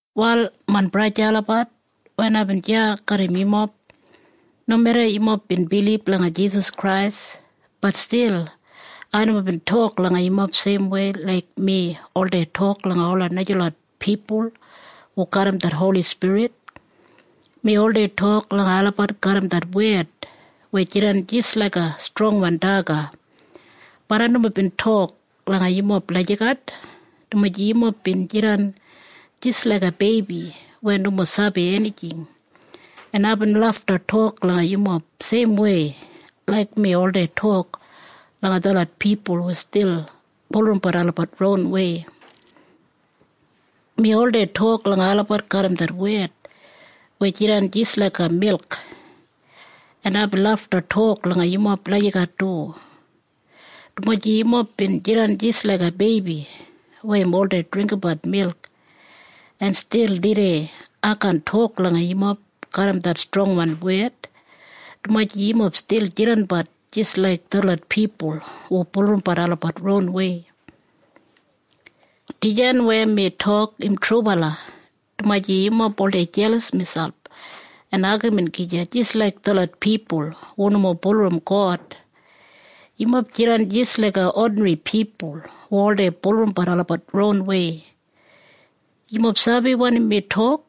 Wal main braja en sista olabat, wen aibin deya garram yumob, nomeda yumob bin bilib langa Jisas Krais, bat stil ai nomo bin tok langa yumob seimwei laik mi oldei tok langa ola najalot pipul hu garram det Holi Spirit. Mi oldei tok langa olabat garram det wed weya jidan jis laiga strongwan daga. Bat ai nomo bin tok langa yumob lagijat, dumaji yumob bin jidan jis laiga beibi weya nomo sabi enijing, en aibin lafta tok langa yumob seimwei laik mi oldei tok langa detlot pipul hu stil bulurrumbat olabat ronwei. Mi oldei tok langa olabat garram det wed weya jidan jis laik milk. En aibin lafta tok langa yumob lagijat du, dumaji yumob bin jidan jis laiga beibi weya im oldei dringgimbat milk. En stil tudei ai kaan tok langa yumob garram det strongwan wed, dumaji yumob stil jidanbat jis laik detlot pipul hu bulurrumbat olabat ronwei. Dijan weya mi tok im trubala, dumaji yumob oldei jelas miselp en agamin gija jis laik detlot pipul hu nomo bulurrum God. Yumob jidan jis laiga odinri pipul hu oldei bulurrumbat olabat ronwei. Yumob sabi wanim mi tok?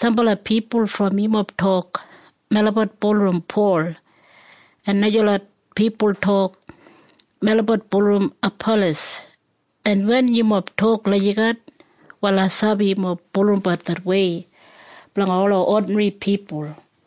Sambala pipul brom yumob tok, “Melabat bulurrum Pol.” En najalot pipul tok, “Melabat bulurrum Apalas.” En wen yumob tok lagijat, wal ai sabi yumob bulurrumbat det wei blanga ola odinri pipul.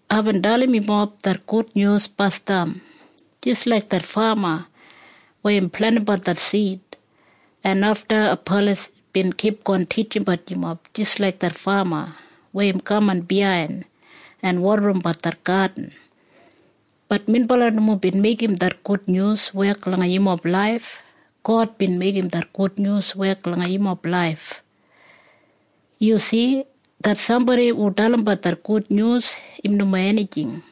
Aibin dalim yumob det gudnyus basdam jis laik det fama weya im plentimbat det sid, en afta Apalas bin kipgon titjimbat yumob jis laik det fama weya im kaman biyain en wodarimbat det gadin. Bat minbala nomo bin meigim det gudnyus wek langa yumob laif. God bin meigim det gudnyus wek langa yumob laif. Yu si? Det sambodi hu dalimbat det gudnyus, im nomo enijing.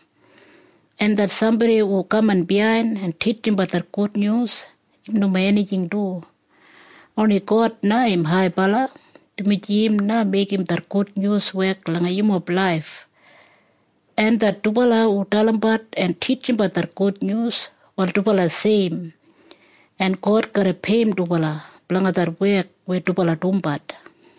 En det sambodi hu kaman biyain en titjimbat det gudnyus, im nomo enijing du. Oni God na im haibala, dumaji im na meigim det gudnyus wek langa yumob laif. En det dubala hu dalimbat en titjimbat det gudnyus, wal dubala seim, en God garra peiyim dubala blanga det wek weya dubala dumbat.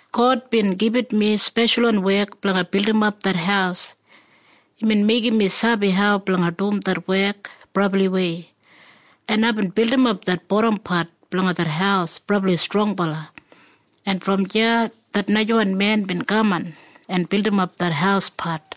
God bin gibit mi speshalwan wek blanga bildimap det haus. Imbin meigim mi sabi hau blanga dum det wek brabliwei, en aibin bildimap det bodampat blanga det haus brabli strongbala, en brom deya det najawan men bin kaman en bildimap det hauspat.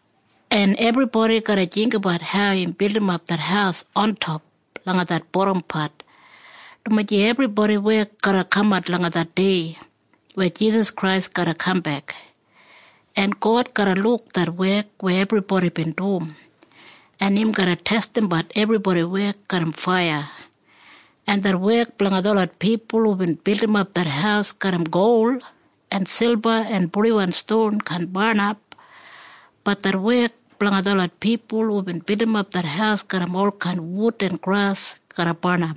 En ebribodi garra jinggabat hau im bildimap det haus ontop langa det bodampat, dumaji ebribodi wek garra kamat langa det dei weya Jisas Krais garra kambek, en God garra luk det wek weya ebribodi bin dum, en im garra testimbat ebribodi wek garram faiya, en det wek blanga detlot pipul hubin bildimap det haus garram gol en silba en purdiwan ston kaan barnap. Bat det wek blanga detlot pipul hubin bildimap det haus garram olkain wud en gras garra barnap.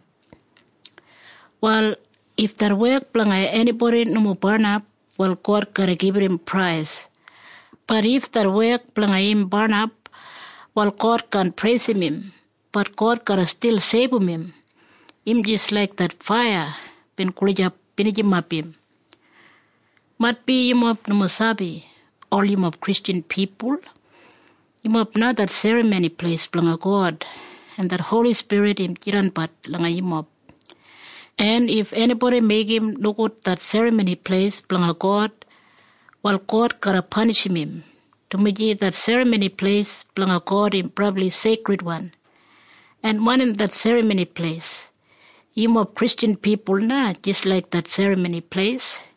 Wal if det wek blanga enibodi nomo barnap, wal God garra gibit im prais. Bat if det wek blanga im barnap, wal God kaan preisim im. Bat God garra stil seibum im. Im jis laik det faiya bin gulijap binijimap im. Maitbi yumob nomo sabi. Ol yumob Kristjan pipul, yumob na det serramoni pleis blanga God, en det Holi Spirit im jidanbat langa yumob. En if enibodi meigim nogud det serramoni pleis blanga God, wal God garra panishim im, dumaji det serramoni pleis blanga God im brabli seikridwan. En wanim det serramoni pleis? Yumob Kristjan pipul na jis laik det serramoni pleis.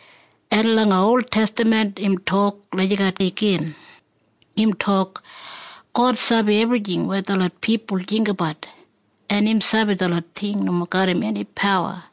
En langa oltestaman im tok lagijat igin. Im tok, “God sabi ebrijing weya detlot pipul jinggabat, en im sabi detlot ting nomo garram eni pawa.”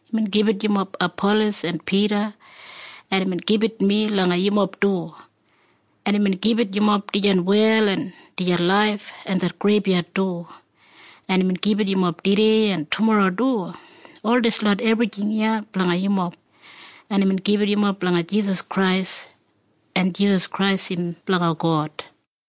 Imbin gibit yumob Apalas en Pida, en imbin gibit mi langa yumob du. En imbin gibit yumob dijan wel en dijan laif en det greibyad du. En imbin gibit yumob tudei en tumorro du. Ol dislot ebrijing iya blanga yumob. En imbin gibit yumob langa Jisas Krais. En Jisas Krais im blanga God.